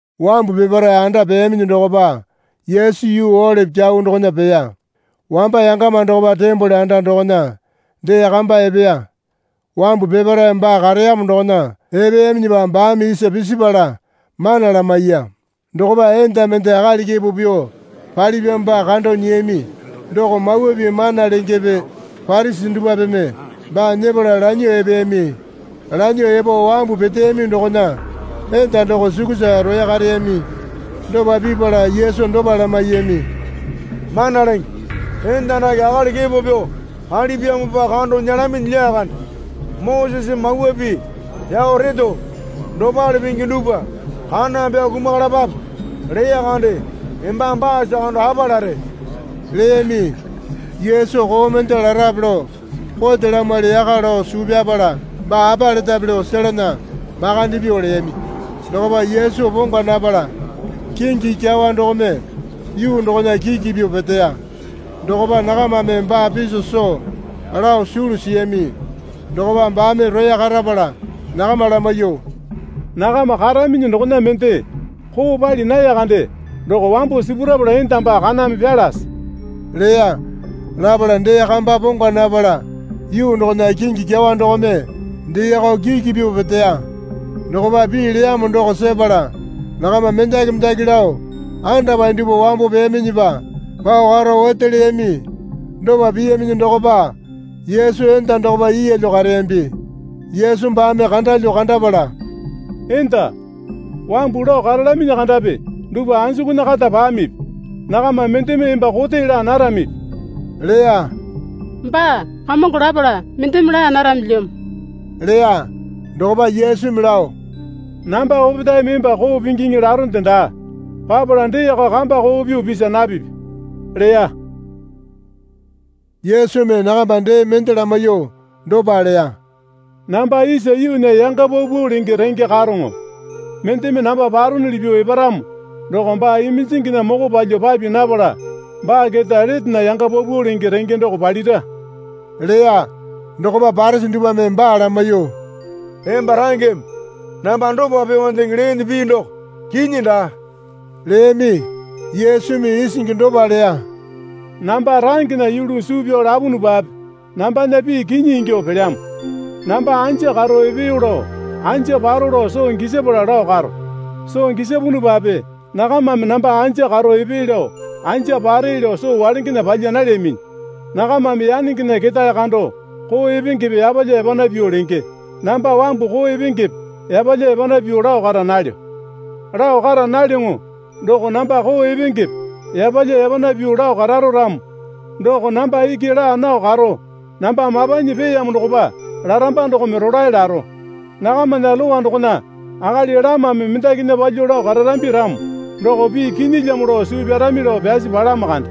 Wambu peparae anda peyaminyi dokopa Yesu yuu Olipi Kyau dokona peya. Wamba yangama dokopa tembole anda dokona dee kamba epeya. Wambu peparae baa kareyamo dokona epeyaminyipa baame isa pisipala mana lamaiya. Dokopa enda mende akali kepo pyuo palipyamopa kando nyiyami doko Mawa Pii mana lengepe Parisi dupwapeme baa nyepala lanyuo epeyami. Lanyuo epo wambu peteyami dokona enda doko sukusa roya kareyami. Dopa pipala Yesu dopa lamaiyami. Mana Lenge, enda dake akali kepo pyuo palipyamopa kando nyelaminyi lyakande. Moseseme Mawa Pii pyao reto, Dopale pingi dupwa kaname pyao kumakalapape leya kande. Embame baasa kando apa lare? leyami. Yesu koo mende larape lao kote lamwali yaka lao suu pyapala baa apa letape lao selana makande pyuo leyami. Dokopa Yesu pongwa napala kingi kyawa dokome yuu dokona kiki pyuo peteya. Dokopa nakamame baa piso soo lao sulu siyami dokopa baame roya karapala nakama lamaiyuo, Nakama karaminyi dokona mende koo pali naya kande doko wambo sipurapala enda baa kaname pyalase leya. Lapala dee kamba pongwa napala yuu dokona kingi kyawa dokome deeyako kiki pyuo peteya. Dokopa pii leyamo doko sepala nakama mendaki mendaki lao andapae dupwa wambo peyaminyipa pao karo ote leyami. Dopa piyaminyi dokopa Yesu enda dokopa yeelyo kareyambi. Yesu baame kandalyuo kandapala, Enda, wambu lao karalaminyi kandapi dupwa anjukunya kata pamipi? Nakama mendeme emba kote laa naramipi? leya. Baa, Kamongo lapala, Mendeme laa naramilyamo leya. Dokopa Yesumi lao, Namba opetaeme emba koo pingiŋi laronde daa. Papala deeko kamba koo pyuo pisa napipi leya. Yesumi nakama dee mende lamaiyuo dopa leya. Namba isa yuunya yanga paupau lenge renge karoŋo. Mendeme namba paronuli pyuo eparamo doko baa iminjinginya moko palyuo papi napala baa keta letena yanga paupau lenge renge doko palira leya. Dokopa Parisi dupwame baa lamaiyuo, Emba rangeme namba dopa pyuondeŋe leene pii doko kinyi daa, leyami. Yesumi isingi dopa leya. Namba rangena yulu suu pyao lapunupape nambana pii kinyi ingyuo pelyamo. Namba anja karo epeyo lao anja paro lao soo gisapala lao karo. Soo gisapunupape nakamame namba anja karo epee lao anja pare lao soo walengena palya nalyaminyi. Nakamame yanengena ketae kando koo epengepe yapalya yapana pyuo lenge. Namba wambu koo epengepe yapalya yapana pyuo lao kara nalyo. Lao kara nalyoŋo doko namba koo epengepe yapalya yapana pyuo lao kararo ramo doko namba iki laa nao karo namba mapanyi peeyamo dokopa laramba dokome rolae laro. Nakamana Lowa dokona akali lamame mendakinya palyuo lao kararambi ramo doko pii kinyilyamo lao suu pyarami lao pyasi palamo kande.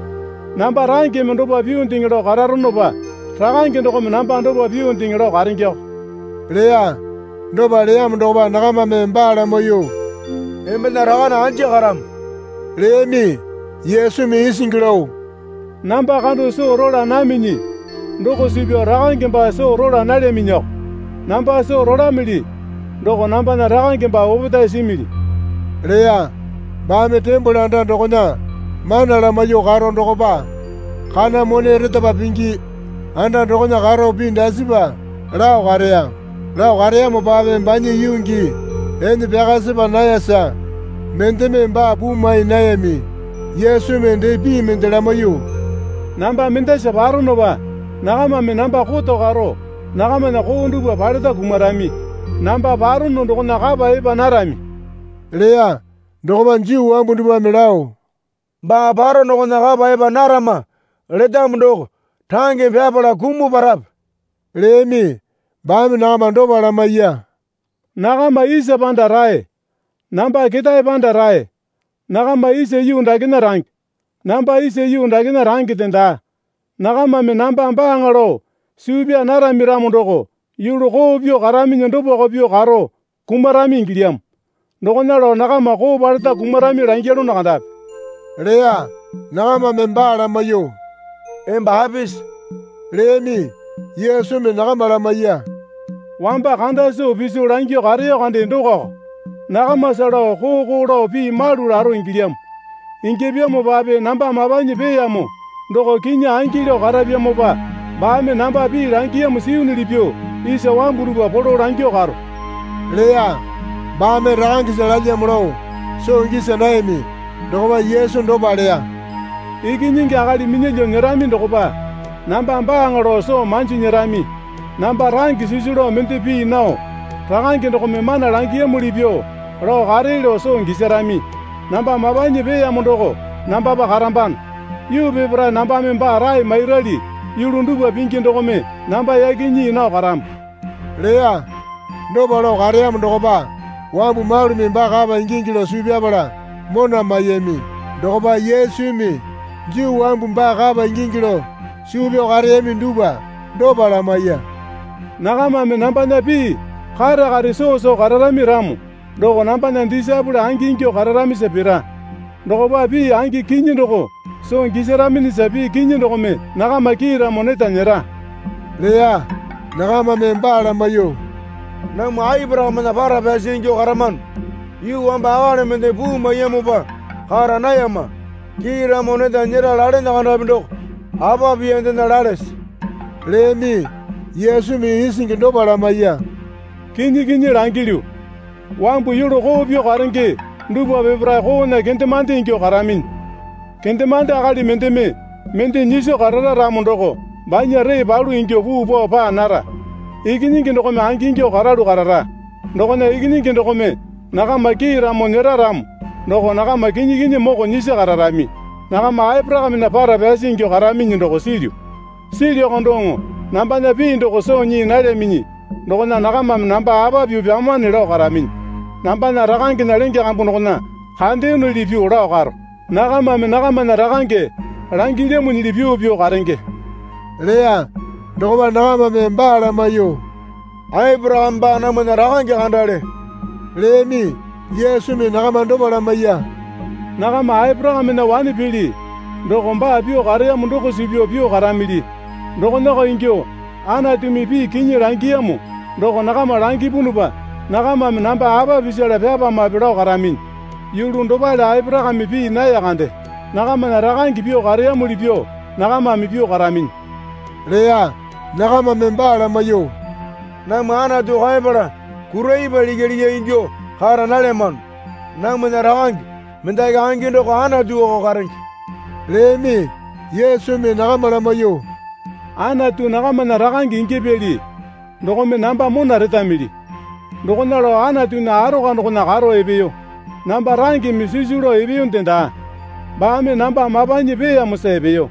Namba rangeme dopa pyuondeŋe lao karonopa Rakange dokome namba dopa pyuondeŋe lao karengeko leya. Dopa leyamo dokopa nakamame baa lamaiyuo, Embena rakane anja karamo? leyami. Yesumi isingi lao, Namba kando soo rola naminyi doko suu pyao Rakange baa soo rola nalyaminyiko. Namba soo rolamili doko nambana Rakange baa opetae simili, leya. Baame tembole anda dokona mana lamaiyuo karo dokopa kana mone retapa pingi anda dokona karo pii dasipa lao kareya. Lao kareyamopape banya yuu gii ene pyaka sepa nayasa mendeme baa puu mai nayami. Yesumi dee pii mende lamaiyuo, Namba mendasa paronopa nakamame namba koto karo nakamana koo dupwa paleta kumarami. Namba parono dokona kapa epa narami leya. Dokopa Juu wambu dupwame lao, Baa paro dokona kapa epa narama letamo doko rangeme pyapala kumuo parape? leyami. Baame nakama dopa lamaiya. Nakama isa panda rae, namba ketae panda rae, nakama isa yuu dakena range, namba isa yuu dakena rangende daa. Nakamame namba Baaŋa lao suu pyaa narami ramo doko yulu koo pyuo karaminyi dopako pyuo karo kumarami ingilyamo. Dokona lao nakama koo paleta kumarami langyalono kandapi leya. Nakamame baa lamaiyuo, Emba apisi? leyami. Yesumi nakama lamaiya. Wamba kanda soo piso langyuo kareyo kande dokoko. Nakamasa lao koo koo lao pii malu laro ingilyamo. Ingyapyamopape namba mapanyi peeyamo doko kinyi angi lao karapyamopa baame namba pii langiyamo siyunuli pyuo isa wambu dupwa polo langyuo karo leya. Baame Rakangesa lalyamo lao soo gisa nayami. Dokopa Yesu dopa leya. Ikinyingi Akali minyalyuo nyerami dokopa namba Baaŋa lao soo manji nyerami. Namba range sisu lao mende pii nao Rakange dokome mana langiyamuli pyuo lao karee lao soo gisarami. Namba mapanyi peeyamo doko nambapa karambano. Yuu peparae nambame baa rae mairali yulu dupwa pingi dokome namba yaki nyii nao karamo leya. Dopa lao kareyamo dokopa wambu malumi baa kapa ingingi lao suu pyapala mona maiyami. Dokopa Yesumi Juu wambu baa kapa ingingi lao suu pyao kareyami dupwa dopa lamaiya. Nakamame nambana pii kare kare soo soo kararami ramo doko nambana disaepole angingyuo kararamisa pira. Dokopa pii angi kinyi doko soo gisaraminyisa pii kinyi dokome nakama kiiramo neta nyera leya. Nakamame baa lamaiyuo, Namwa Aporakamena para pyasi ingyuo karamano. Yuu wamba akali mendeme puu maiyamopa kara nayama. Kiiramo neta nyera lalene kandapi doko apa piyandena lalese? leyami. Yesumi isingi dopa lamaiya. Kinyi kinyi langilyu, wambu yulu koo pyuo karenge dupwa peparae koona kendemande ingyuo karaminyi. Kendemande akali mendeme mende nyiso karara ramo doko banya ree palu ingyuo puu pao paa nara. Ikinyingi dokome angingyuo karalu karara. Dokona Ikinyingi dokome nakama kiiramo nyera ramo doko nakama kinyi kinyi moko nyisi kararami. Nakama Aporakamena para pyasi ingyuo karaminyi doko silyu. Silyuko doŋo nambana pii doko soo nyii nalyaminyi dokona nakamame namba apa pyuo pyamane lao karaminyi. Nambana Rakangena lenge kambu dokona kandeyonuli pyuo lao karo, nakamame nakamana rakange langilyamo nyili pyuo pyuo karenge leya. Dokopa nakamame baa lamaiyuo, Aporakame baa namwana rakange kandale leyami. Yesumi nakama dopa lamaiya. Nakama Aporakamena wane pili doko baa pyuo kareyamo doko suu pyao pyuo karamili. Dokonako ingyuo Anatumi pii kinyi langiyamo doko nakama langipunupa nakamame namba apa pisala pyapamape lao karaminyi. Yulu dopale Aporakame pii naya kande. Nakamana rakange pyuo kareyamuli pyuo nakamame pyuo karaminyi leya. Nakamame baa lamaiyuo, Namwa Anatu kaeyapala kura ipwa likya likya ingyuo kara nalyamano. Namwana Rakange mendaki angi doko Anatuko karenge leyami. Yesumi nakama lamaiyuo, Anatu nakamana Rakange ingyapyali dokome namba mona retamili. Dokona lao Anatunya arokwa dokona karo epeyo. Namba rangeme sisu lao epeyonde daa. Baame namba mapanyi peeyamosa epeyo.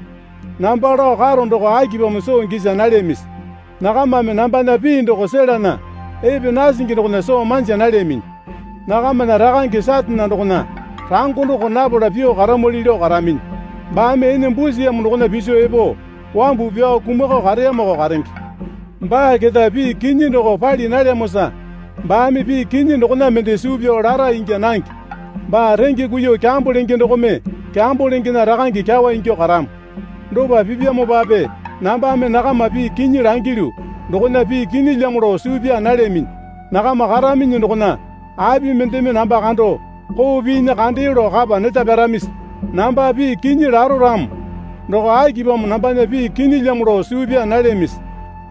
Namba lao karo doko akipamo soo gisa nalyamisi? Nakamame nambana pii doko selana epe nasingi dokona soo manja nalyaminyi. Nakamana Rakange Satane dokona rango doko napala pyuo karamwali lao karaminyi. Baame ene busiyamo dokona piso epo wambu pyao kumakao kareyamoko karenge. Baa keta pii kinyi doko pali nalyamosa baame pii kinyi dokona mende suu pyao lara ingya nange. Baa renge kuiyuo kyambo lenge dokome kyambo lengena rakange kyawa ingyuo karamo. Dopa pipyamopape nambame nakama pii kinyi langilyu dokona pii kinyilyamo lao suu pyaa nalyaminyi. Nakama karaminyi dokona api mendeme namba kando koo piinyi kandeyo lao kapa neta pyaramisi? Namba pii kinyi laro ramo doko akipamo nambana pii kinyilyamo lao suu pyaa nalyamisi?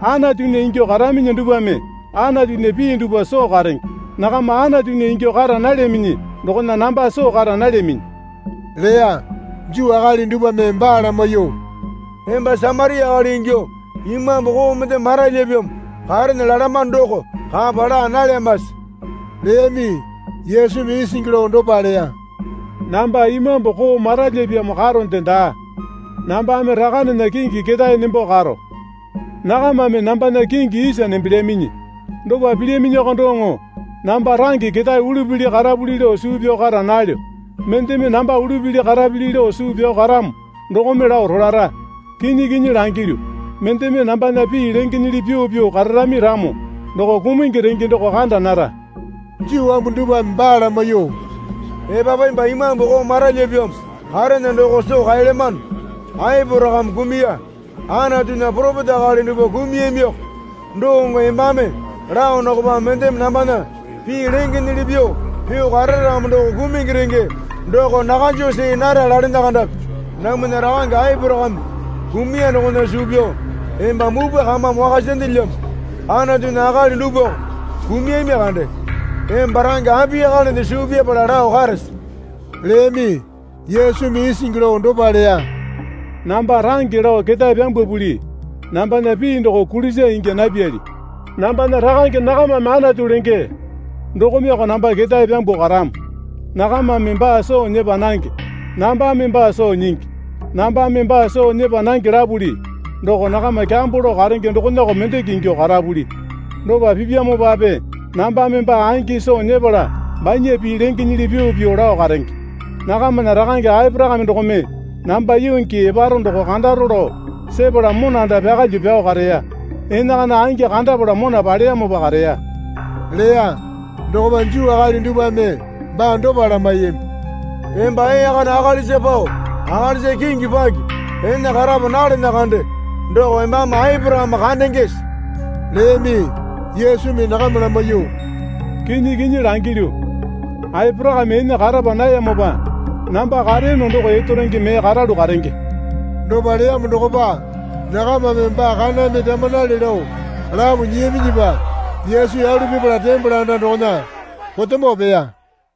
Anatunya ingyuo karaminyi dupwame Anatunya pii dupwa soo karenge. Nakama Anatunya ingyuo kara nalyaminyi dokona namba soo kara nalyaminyi leya. Juu akali dupwame baa lamaiyuo, Emba Samaria akali ingyuo imambu koo mendeme maralyipyamo karene lalamano doko kapa laa nalyamase? leyami. Yesumi isingi lao dopa leya. Namba imambu koo maralyapyamo karonde daa. Nambame Rakanena kingi ketae nembo karo. Nakamame nambana kingi isa nembelyaminyi. Dopa pilyaminyiko doŋo namba range ketae ululi karapuli lao suu pyao kara nalyo. Mendeme namba ululi karapili lao suu pyao karamo dokome lao rolara. Kinyi kinyi langilyu, mendeme nambana pii lengenyili pyuo pyuo kararami ramo doko kumungi renge doko kanda nara. Juu wambu dupwame baa lamaiyuo, Epapu emba imambu koo maralyapyamo karene doko soo kaelyamano. Aporakame kumuya. Anatunya poropeta akali dupwa kumuyamiko doŋo embame lao dokopa mendeme nambana pii lengenyili pyuo pyuo karara ramo doko kumungi renge doko nakanju see nara lalene kandapi. Namwana rakange Aporakame kumuya dokona suu pyao emba mupwa kamame wakasandelyamo. Anatunya akali dupwako kumuyami kande. Emba range apiyakalende suu pyapala lao karese? leyami. Yesumi isingi lao dopa leya. Namba range lao ketae pyambwapuli nambana pii doko kulisa ingya napyali. Nambana Rakange nakamame Anatu lenge dokomeko namba ketae pyambuo karamo. Nakamame baa soo nyepa nange. Nambame baa soo nyingi. Nambame baa soo nyepa nange lapuli doko nakama kyambo lao karenge dokonako mendeke ingyuo karapuli. Dopa pipyamopape nambame baa angi soo nyepala banya pii lengenyili pyuo pyuo lao karenge. Nakamana rakange Aporakame dokome namba yuu gii eparo doko kandaro lao sepala monanda pyakalyuo pyao kareya. Enakana angi kandapala mona paleyamopa kareya leya. Dokopa Juu akali dupwame baa dopa lamaiyami. Emba ee kana akalisa pao akalisa kingi paki ene karapa nalene kande doko embame Aporakame kandengese? leyami. Yesumi nakama lamaiyuo, Kinyi kinyi langilyu, Aporakame ene karapa nayamopa namba kareyono doko erotonge mee karalu karenge. Dopa leyamo dokopa nakamame baa kaname pyamanale lao lapo nyiyaminyipa Yesu yalu pipala tembole anda dokona potemo peya.